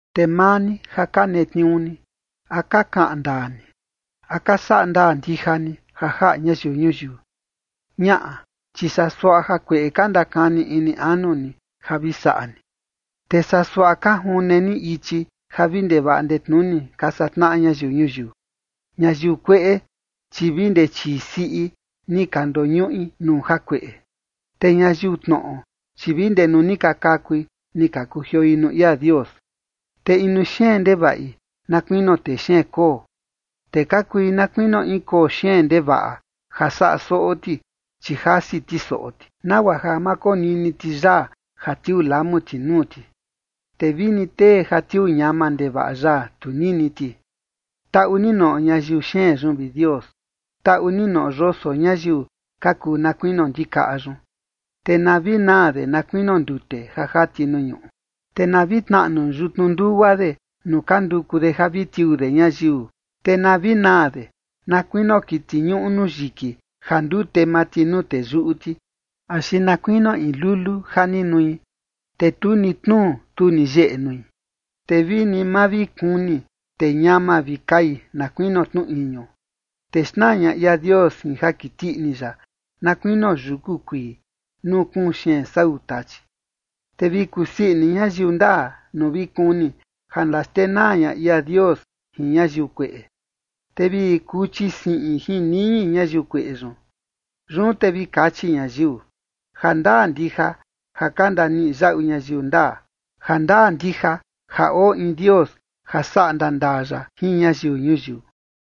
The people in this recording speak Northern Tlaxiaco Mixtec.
Te maa ni ja ka netniuu ni, ¿a ka kaꞌan ndaa ni? ¿A ka saꞌa ndaa ndija ni ja jaꞌa ñayiu ñuyiu? Ñaꞌa, chi saa suaꞌa jakueꞌe ka ndakani ini anu ni ja vi saꞌa ni, te saa suaꞌa ka june ni ichi ja vi ndevaꞌa ndetnuni ka satnaꞌa ñayiu ñuyiu. Ñayiu kueꞌe, chi vi ndee chii siꞌi ni ka ndoñuꞌi nuu jakueꞌe, te ñayiu tnoꞌo, chi vi ndee nuu ni ka kakui, ni ka kujioi nuu ia Dios. Te inu xeen ndevaꞌi na kuinio texeen koo, te ka kui na kuinio in koo xeen ndevaꞌa ja saꞌa soꞌo ti, chi jasi ti soꞌo ti, nagua ja ma konini ti yaa ja tiuu lamu ti nuu ti, te vini tee ja tiuu ñama ndevaꞌa yaa, tu nini ti. Taꞌu ni noꞌo ñayiu xeen yun, vi Dios. Taꞌu ni noꞌo yoso ñayiu ka kuu na kuinio ndikaꞌa yun. Te na vi naa de na kuinio ndute ja jati nuu ñuꞌu, te na vi tnaꞌnu yutnu ndugua de nuu ka nduku de ja vi tiuu de ñayiu. Te na vi naa de na kuinio kiti ñuꞌu nuu yiki ja ndute maa ti nuu teyuꞌu ti, axi na kuinio in lulu ja ni nui, te tu ni tnuu tu ni yeꞌe nui. Te vini ma vi kuni, te ñama vi kai na kuinio tnu iñu, te xnaa ña ia Dios jin ja kiti ini ya na kuinio yuku kuii, nuu kuun xeen sau tachi. Te vi kusii ini ñayiu ndaa nuu vi kuni ja ndaxtenaa ña ia Dios jin ñayiu kueꞌe, te vi kuchi siꞌin jin niñi ñayiu kueꞌe yun. Yun te vi kachi ñayiu: “Jandaa ndija ja ka ndaniꞌi yaꞌu ñayiu ndaa. Jandaa ndija ja oo in Dios ja saꞌa ndaa ndaa ya jin ñayiu ñuyiu.”